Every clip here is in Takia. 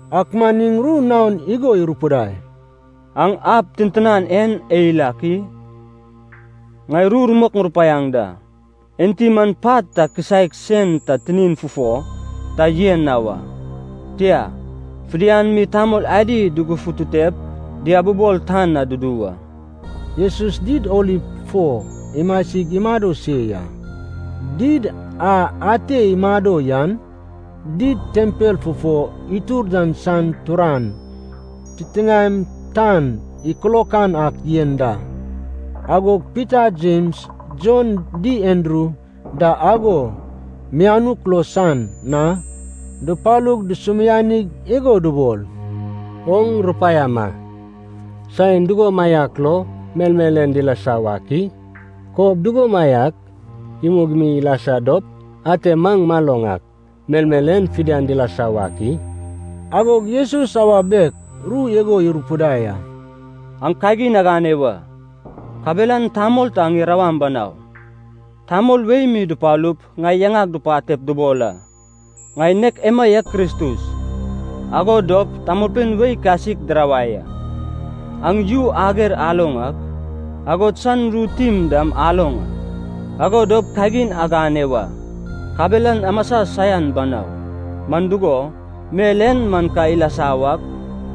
Ak man iŋ ru naon igo irupidai, “Aŋ ab tintinan en eil ak i? Ŋai ru rumok ŋurupaiaŋ da, ente man pat ta kisaek sen ta tinin fufo ta yen na wa. Tia, fidian mi tamol adi dugufututep diabibol tan na dudu wa.” Jesus Did Oliv fo imasig imado se ya. Did a ate imado yan did tempel fufo itur dan san turan, titiŋaem tan ikilokan ak yen da. Agog Pita, Jems, Jon di Andru da ago mianuk lo san na dupalug dusumianig igo dubol. “Oŋ rupaiama, saen dugomaiak lo melmel en dilasa wak i? Kob dugomaiak imug mi ilasa dop ate maŋ maloŋ ak, melmel en fidian dilasa wak i?” Agog Jesus awa biek ru igo irupidai a. “Aŋ kagin agane wa, kabelan tamol ta aŋ irawaŋ banau. Tamol wei mi dupalup ŋai yaŋag dupatep dubol a, ‘Ŋai nek emaiak Kristus.’ Ago dop tamolpein wei kasik dirawai a. Aŋ yu ager aloŋ ak, agod san ru tim dam aloŋ a. Ago dop kagin agane wa, kabelan amasa saian banau, man dugo, mel en man ka ilasa wak,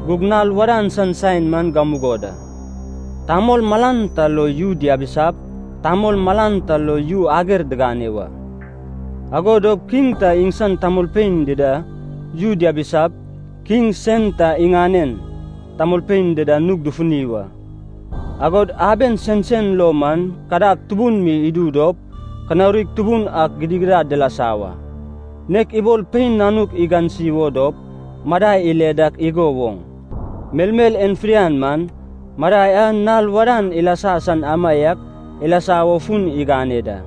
gug nal wadan san saen man gamugo da. Tamol malan ta lo yu diabisap, tamol malan ta lo yu ager digane wa. Ago dop kiŋ ta iŋsan tamolpein dida yu diabisap, kiŋ sen ta iŋanen tamolpein dida nug dufuni wa. Agod aben sensen lo man kadag tubun mi idu dop kanaurig tubun ak gidigidad dilasa wa. Nek ibol pein nanuk igansi wo dop madai ile dak igo woŋ, melmel en fidian man, madai a nal wadan ilasa san amaiak ilasa wo fun igane da.”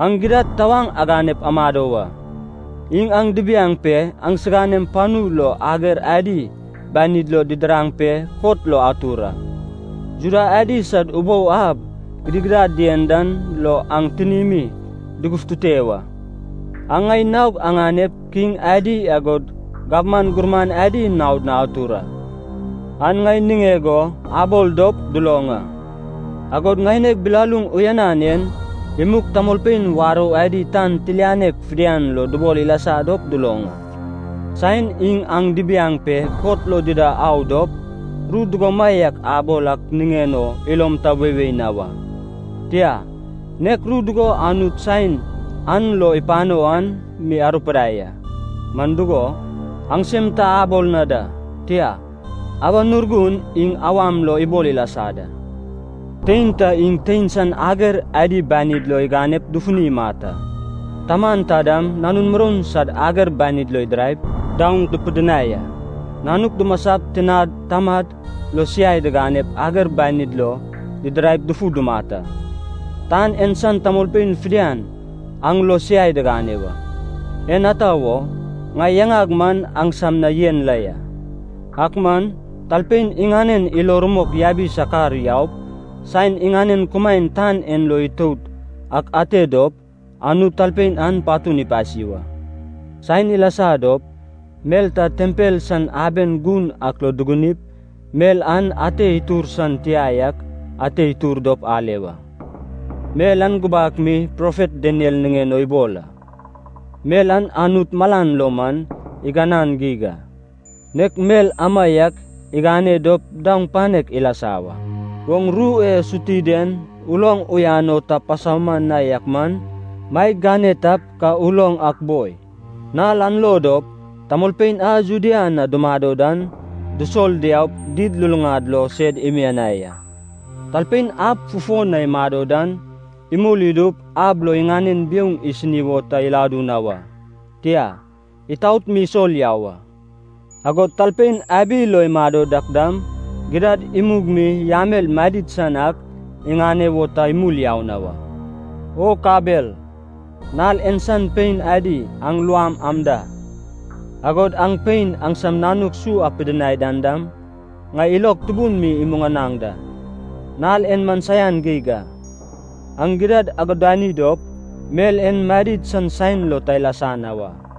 “Aŋ gidad tawaŋ aganep amado wa. Iŋ aŋ dibiaŋ pe aŋsiganem panu lo ager adi banid lo didiraŋ pe kot lo atur a. Juda adi sad ubou ab gidigidad dien dan lo aŋ tinimi dugufutute wa. Aŋ ŋai naog aŋanep kiŋ adi agod gabman gurman adi naod na atur a, an ŋai niŋeg o abol dop duloŋ a. Agod ŋaineg bilaluŋ uyanan en imug tamolpein warou adi tan tilianek fidian lo dubol ilasa dop duloŋ a. Saen iŋ aŋ dibiaŋ pe kot lo dida au dop, ru dugomaiak abol ak niŋen o ilom ta weiwei na wa. Tia, nek ru dugo Anut saen an lo ipano an mi arupidai a, man dugo, aŋsem ta abol na da, tia, Awan Urgun iŋ awam lo ibol ilasa da. “Tein ta iŋ tein san ager adi banid lo iganep dufuni imat a. Taman ta dam nanun muroun sad ager banid lo idiraip daoŋ dupidinai a. Nanuk dumasap tinad tamad lo siai diganep ager banid lo didiraip dufu dumat a. Tan en san tamolpein fidian aŋ lo siai digane wa, en ata wo, ŋai yaŋag man aŋsam na yen la ya. Ak man, talpein iŋanen ilo rumok yabi sakar yaup, saen iŋanen kumaen tan en lo itout ak ate dop, Anut talpein an patun ipasi wa. “Saen ilasa dop, mel ta tempel san aben gun ak lo dugunip, mel an ate itur san tia yak ate itur dop ale wa. Mel an gubak mi profet Daniel niŋen o ibol a. Mel an Anut malan lo man iganan geig a, nek mel amaiak igane dop daoŋ panek ilasa wa. (Oŋ ru e suti den uloŋ uyan o ta pasauman na yak man, maeg gane tap ka uloŋ ak boi.) Nal an lo dop, tamolpein a Judea na dumado dan, dusol diaup did luluŋad lo sed imianai a. Talpein ab fufo na imado dan, imul idup ab lo iŋanen biouŋ isini wo ta iladu na wa, tia, itaot mi isol yau a. Agod talpein abi lo imado dak dam, gidad imug mi yamel madid san ak iŋane wo ta imul yau na wa. O kabel, nal en san pein adi aŋ luam am da, agod aŋ pein aŋsam nanuk su apidinai dan dam, ŋai ilog tubun mi imuŋanaŋ da! Nal en man saian geig a. Aŋ gidad agudani dop, mel en madid san saen lo ta ilasa na wa.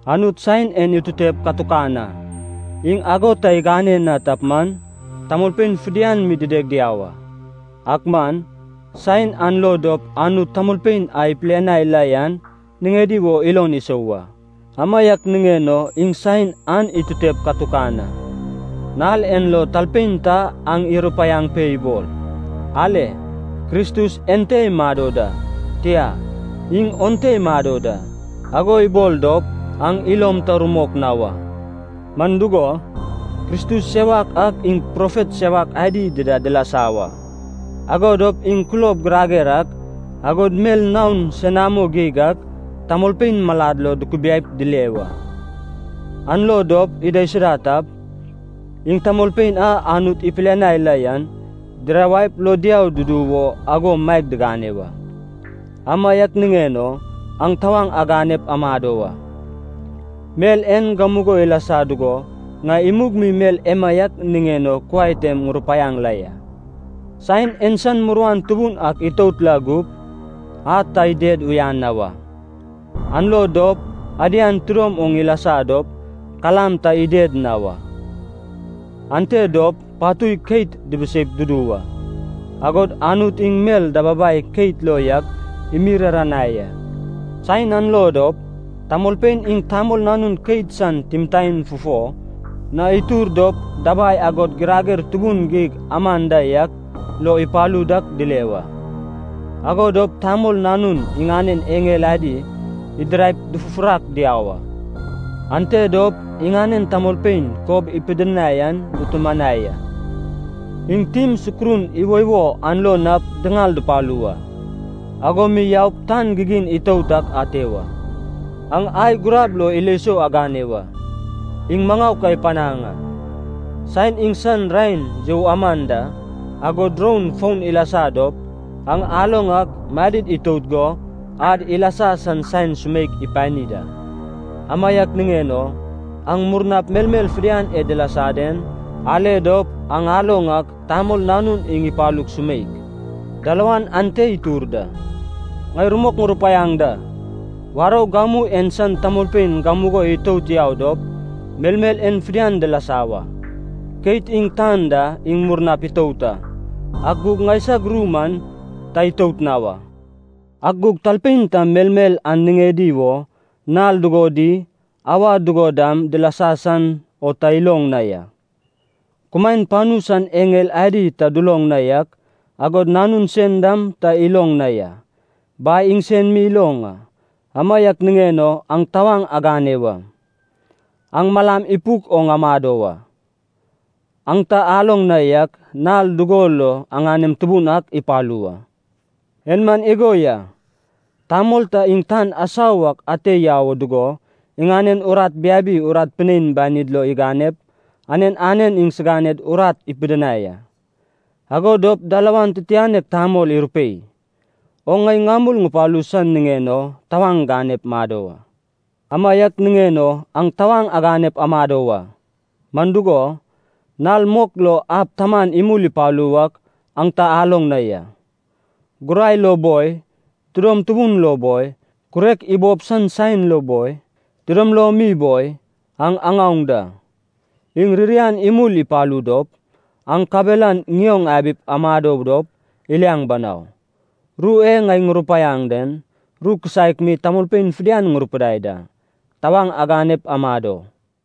Anut saen en itutep katukan a, iŋ ago ta igane na tap man, tamolpein fidian mi dideg diau a. Ak man, saen an lo dop Anut tamolpein a ipilianai la yan niŋedi wo ilon isou wa. Amaiak niŋen o iŋ saen an itutep katukan a. Nal en lo talpein ta aŋ irupaiaŋ pe ibol, ‘Ale, Kristus ente imado da!’ tia, ‘Iŋ onte imado da!’ ago ibol dop, aŋ ilom ta rumok na wa. Man dugo, kristus sewak ak iŋ profet sewak adi dida dilasa wa, ago dop iŋ kulob girager ak, agod mel naon senamo geig ak tamolpein malad lo dukubiaip dile wa. An lo dop idaisuda tap, iŋ tamolpein a Anut ipilianai la yan dirawaip lo diau dudu wo ago maeg digane wa. Amaiak niŋen o aŋ tawaŋ aganep amado wa. Mel en gamugo ilasa dugo ŋai imug mi mel emaiak niŋen o kuai tem ŋurupaiaŋ la ya.” “Saen en san muruan tubun ak itout la gup, ‘ad ta ided uyan na wa, an lo dop adian tidom oŋ ilasa dop kalam ta ided na wa. Ante dop patui keit dibiseip dudu wa, agod Anut iŋ mel dababai keit lo yak imiriranai a.’” “Saen an lo dop, tamolpein iŋ Tamol Nanun keit san timtaen fufo na itur dop dabai agod girager tubun geig aman da yak lo ipalu dak dile wa. Ago dop Tamol Nanun iŋanen eŋel adi idiraip dufufurak diau a. Ante dop iŋanen tamolpein kob ipidinai an dutumanai a. Iŋ tim sukurun iwoiwo an lo nap diŋal dupalu wa, ago mi yaup tan gigin itout ak ate wa.” “Aŋ ai gurab lo ilo sou agane wa, iŋ maŋau ka ipanaŋ a. Saen iŋsan raen you aman da, agod roun foun ilasa dop, aŋ aloŋ ak madid itout go ad ilasa san saen sumeik ipani da. Amaiak niŋen o, aŋ murnap melmel fidian e dilasa den, ale dop, aŋ aloŋ ak Tamol Nanun iŋ ipalug sumeik, dalawan ante itur da. Ŋai rumok ŋurupaiaŋ da. Warou gamu en san tamolpein gamugo itout yau dop melmel en fidian dilasa wa. Keit iŋ tan da iŋ murnap itout a, ak gug ŋaisag ru man ta itout na wa.” “Ak gug talpein ta melmel an niŋedi wo nal dugo di auwa dugo dam dilasa san o ta iloŋ na ya. Kumaen panu san eŋel adi ta duloŋ na yak, agod Nanun sen dam ta iloŋ na ya. Bai iŋsen mi iloŋ a. Amaiak niŋen o aŋ tawaŋ agane wa. Aŋ malam ipuk oŋ amado wa. Aŋ ta aloŋ na yak nal dugo lo aŋanem Tubun ak ipalu wa. En man igo ya. Tamol ta iŋ tan asau ak ate yau o dugo iŋanen urat biabi urat pinein banid lo iganep, anen anen iŋsiganed urat ipidinai a. Ago dop dalawan titianek tamol irupei, ‘Oŋ ŋai ŋamul ŋupalu san niŋen o tawaŋ ganep mado wa.’ “Amaiak niŋen o aŋ tawaŋ aganep amado wa, man dugo, nal mok lo ab taman imul ipalu wak aŋ ta aloŋ na ya. Gurai lo boi, tidom tubun lo boi, kurek ibob san saen lo boi, tidom lom mi boi, aŋ aŋaoŋ da. Iŋ ririan imul ipalu dop, aŋ kabelan ŋioŋ abip amado dop iliaŋ banau. Ru e ŋai ŋurupaiaŋ den, ru kisaek mi tamolpein fidian ŋurupidai da: ‘Tawaŋ aganep amado!’”